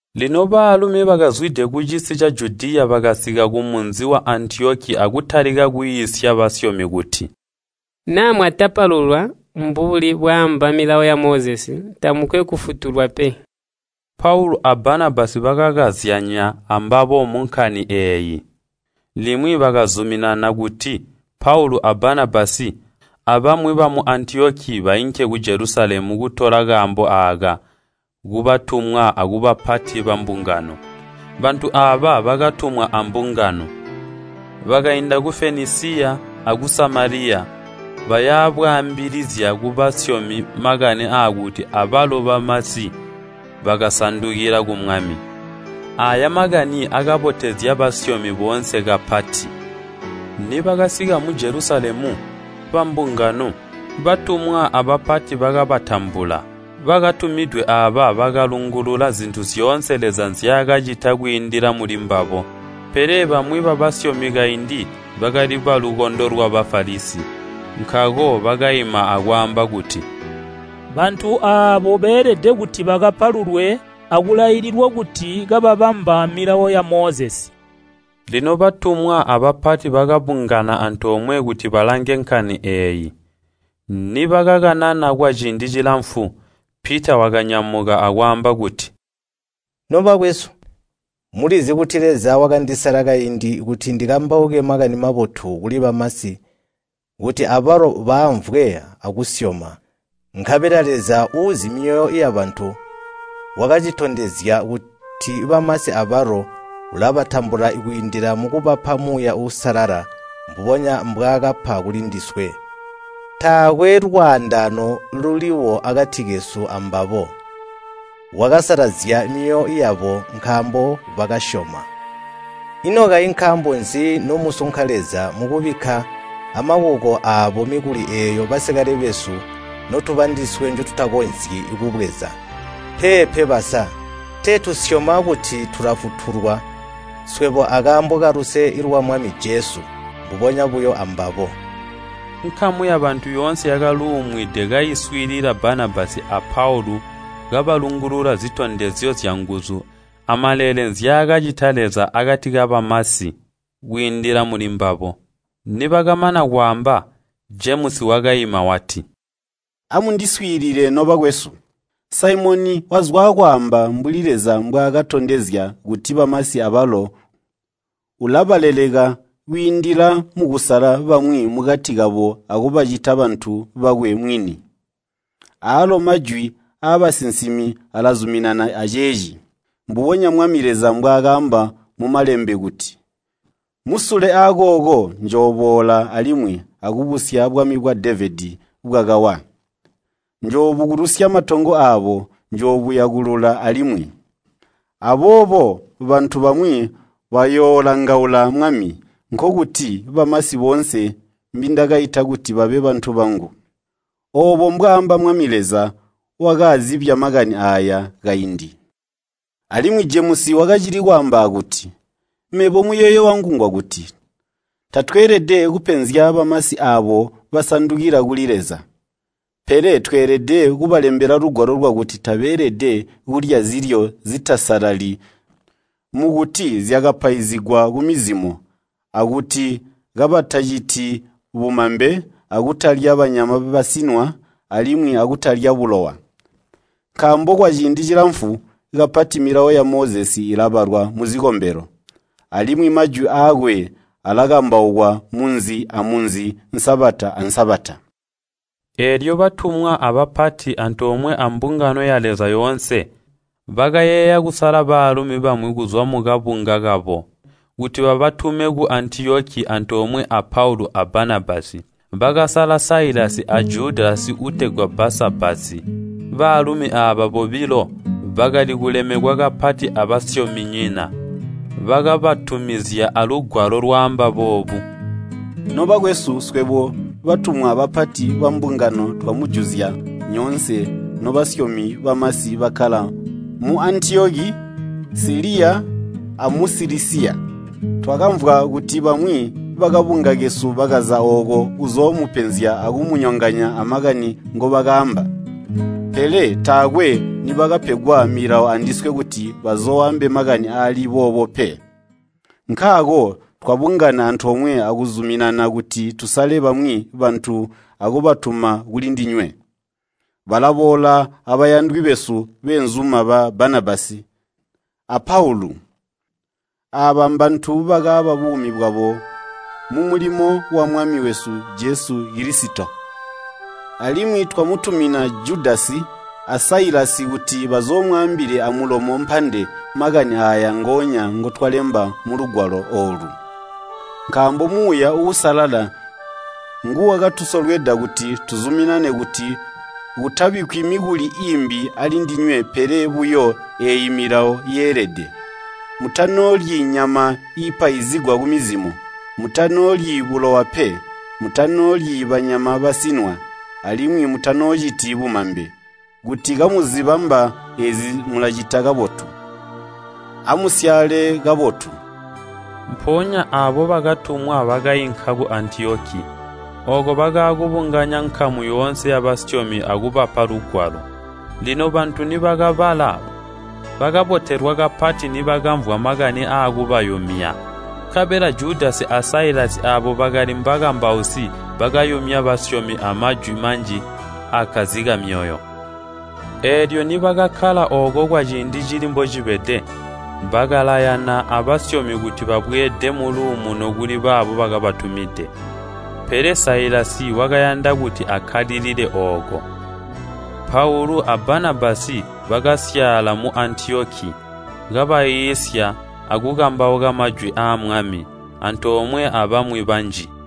Lino baalumi bakazwide kucisi ca Judiya bakasika kumunzi wa Antiyoki akutalika kwiisya basyomi kuti, “Naa mwatapalulwa mbubuli bwaamba Milawo ya Mozesi, tamukwe kufutulwa pe.” Paulu a Banabasi bakakazyanya ambabo munkani eeyi. Limwi bakazuminana kuti Paulu a Banabasi, abamwi bamu Antiyoki bainke ku Jelusalemu kutola kaambo aaka kubatumwa akubapati bambungano. Bantu aaba bakatumwa ambungano. Bakainda ku Fenisiya aku Samaliya, baya bwaambilizya kubasyomi makani aakuti abalo bamasi bakasandukila ku Mwami. Aaya makani akabotezya basyomi boonse kapati. Nibakasika mu Jelusalemu, bambungano, batumwa abapati bakabatambula. Bakatumidwe aaba bakalungulula zintu zyoonse Leza nzyaakacita kwiindila mulimbabo. Pele bamwi babasyomi kaindi bakali balukondo lwa Bafalisi, nkaako bakaima akwaamba kuti, “Bantu aabo beelede kuti bakapalulwe akulaililwa kuti kababamba Milawo ya Mozesi.” Lino batumwa abapati bakabungana antoomwe kuti balange nkani eeyi. Nibakakanana kwaciindi cilamfu, Pita wakanyamuka akwaamba kuti, “Nobakwesu, mulizi kuti Leza wakandisala kaindi kuti ndikambauke Makani Mabotu kuli bamasi kuti abalo baamvwe akusyoma. Nkabela Leza uuzi myoyo yabantu, wakacitondezya kuti bamasi abalo ulabatambula kwiindila mukubapa Muuya Uusalala mbubonya mbwaakapa kulindiswe. Taakwe lwaandaano luliwo akati kesu ambabo, wakasalazya myoyo yabo nkaambo bakasyoma. Ino kayi nkaambo nzi nomusunka Leza mukubikka amakuko aabo mikuli eeyo basikale besu notuba ndiswe njotutakonzyi kubweza? Peepe basa, tee tusyoma kuti tulafutulwa swebo akaambo kaluse lwa Mwami Jesu, mbubonya buyo ambabo.” Nkamu yabantu yoonse yakaluumwide kaiswiilila Banabasi a Paulu kabalungulula zitondezyo zyanguzu amaleele nzyaakacita Leza akati kabamasi kwiindila mulimbabo. Nibakamana kwaamba, Jemusi wakaima wati, “Amundiswiilile nobakwesu! Saimoni wazwaakwaamba mbuli Leza mbwaakatondezya kuti bamasi abalo ulabaleleka kwiindila mukusala bamwi mukati kabo akubacita bantu bakwe mwini. Aalo majwi aabasinsimi alazuminana aceeci, mbubonya Mwami Leza mbwaakaamba mu Malembe kuti, ‘Musule akooku njooboola alimwi, akubusya bwami bwa Devedi bwakawa. Njoobukulusya matongo aabo, njoobuyakulula alimwi. Aboobo bantu bamwi bayoolangaula Mwami, nkokuti bamasi boonse mbindakaita kuti babe bantu bangu. Oobo mbwaamba Mwami Leza wakaazibya makani aaya kaindi.’” Alimwi Jemusi wakacili kwaamba akuti, “Mebo muyeeyo wangu ngwakuti, tatweelede kupenzya bamasi aabo basandukila kuli Leza. Pele tweelede kubalembela lugwalo lwakuti tabeelede kulya zilyo zitasalali mukuti zyakapaizigwa kumizimo, akuti kabataciti bumambe, akutalya banyama basinwa, alimwi akutalya bulowa. Nkaambo kwaciindi cilamfu kapati Milawo ya Mozesi ilabalwa muzikombelo, alimwi majwi aakwe alakambaukwa munzi amunzi Sabata a Sabata.” Eelyo batumwa abapati, antoomwe ambungano ya Leza yoonse, bakayeeya kusala baalumi bamwi kuzwa mukabunga kabo, kuti babatume ku Antiyoki antoomwe a Paulu a Banabasi. Bakasala Sailasi a Judasi uutegwa Baasabasi. Baalumi aaba bobilo bakali kulemekwa kapati abasyominyina. Bakabatumizya alugwalo lwaamba boobu, “Nobakwesu, swebo batumwa abapati bambungano twamujuzya nyoonse nobasyomi bamasi bakkala mu Antiyoki, Siliya amu Silisiya. Twakamvwa kuti bamwi bakabunga kesu bakaza ooko kuzoomupenzya akumunyonganya amakani ngobakaamba. Pele taakwe nibakapegwa milawo andiswe kuti bazooambe makani aali boobo pe. Nkaako twabungana antoomwe akuzuminana kuti tusale bamwi bantu akubatuma kulindinywe. Balaboola abayandwi besu beenzuma ba Banabasi a Paulu. Aaba mbantu bakaaba buumi bwabo mumulimo wa Mwami wesu Jesu Kilisito. Alimwi twamutumina Judasi a Sailasi kuti bazoomwaambile amulomo mpande makani aaya ngonya ngotwalemba mulugwalo oolu. Nkaambo Muuya Uusalala nguwakatusolweda kuti tuzuminane kuti kutabikkwi mikuli iimbi alindinywe pele buyo eeyi milawo yeelede. Mutanoolyi nyama iipaizigwa kumizimo, mutanoolyi bulowa pe, mutanoolyi banyama basinwa, alimwi mutanoociti bumambe. Kuti kamuzibamba eezi mulacita kabotu. Amusyaale kabotu.” Mpoonya aabo bakatumwa bakainka ku Antiyoki. Ooko bakaakubunganya nkamu yoonse yabasyomi akubapa lugwalo. Lino bantu nibakabala, bakabotelwa kapati nibakamvwa makani aakubayumya. Nkabela Judasi a Sailasi aabo bakali mbakambausi bakayumya basyomi amajwi manji aakkazika myoyo. Eelyo nibakakkala ooko kwaciindi cili mbocibede, bakalayana abasyomi kuti babweede muluumuno kuli baabo bakabatumide. [ Pele Sailasi wakayanda kuti akkalilile ooko.] Paulu a Banabasi bakasyaala mu Antiyoki, kabaiisya akukambauka majwi aa Mwami, antoomwe abamwi banji.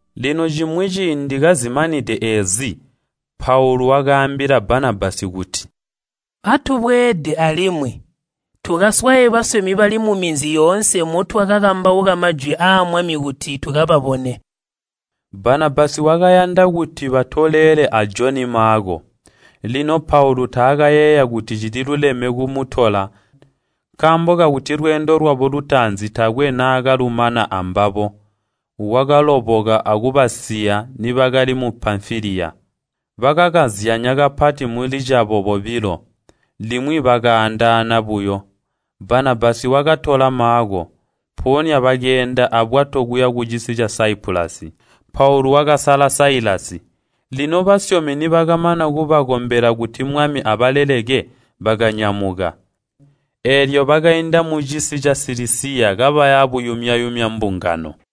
Lino cimwi ciindi kazimanide eezi, Paulu wakaambila Banabasi kuti, “Atubweede alimwi tukaswaye basyomi bali muminzi yoonse motwakakambauka majwi aa Mwami kuti tukababone.” Banabasi wakayanda kuti batolelele a Joni Maako. Lino Paulu taakayeeya kuti cililuleme kumutola nkaambo kakuti lweendo lwabo lutaanzi taakwe naakalumana ambabo, wakaloboka akubasiya nibakali mu Pamfiliya. Bakakazyanya kapati mulicabo bobilo, limwi bakaandaana buyo. Banabasi wakatola Maako, mpoonya bakeenda abwato kuya kucisi ca Saipulasi. Paulu wakasala Sailasi, lino basyomi nibakamana kubakombela kuti Mwami abaleleke, bakanyamuka. Eelyo bakainda mucisi ca Silisiya kabaya buyumya-yumya mbungano.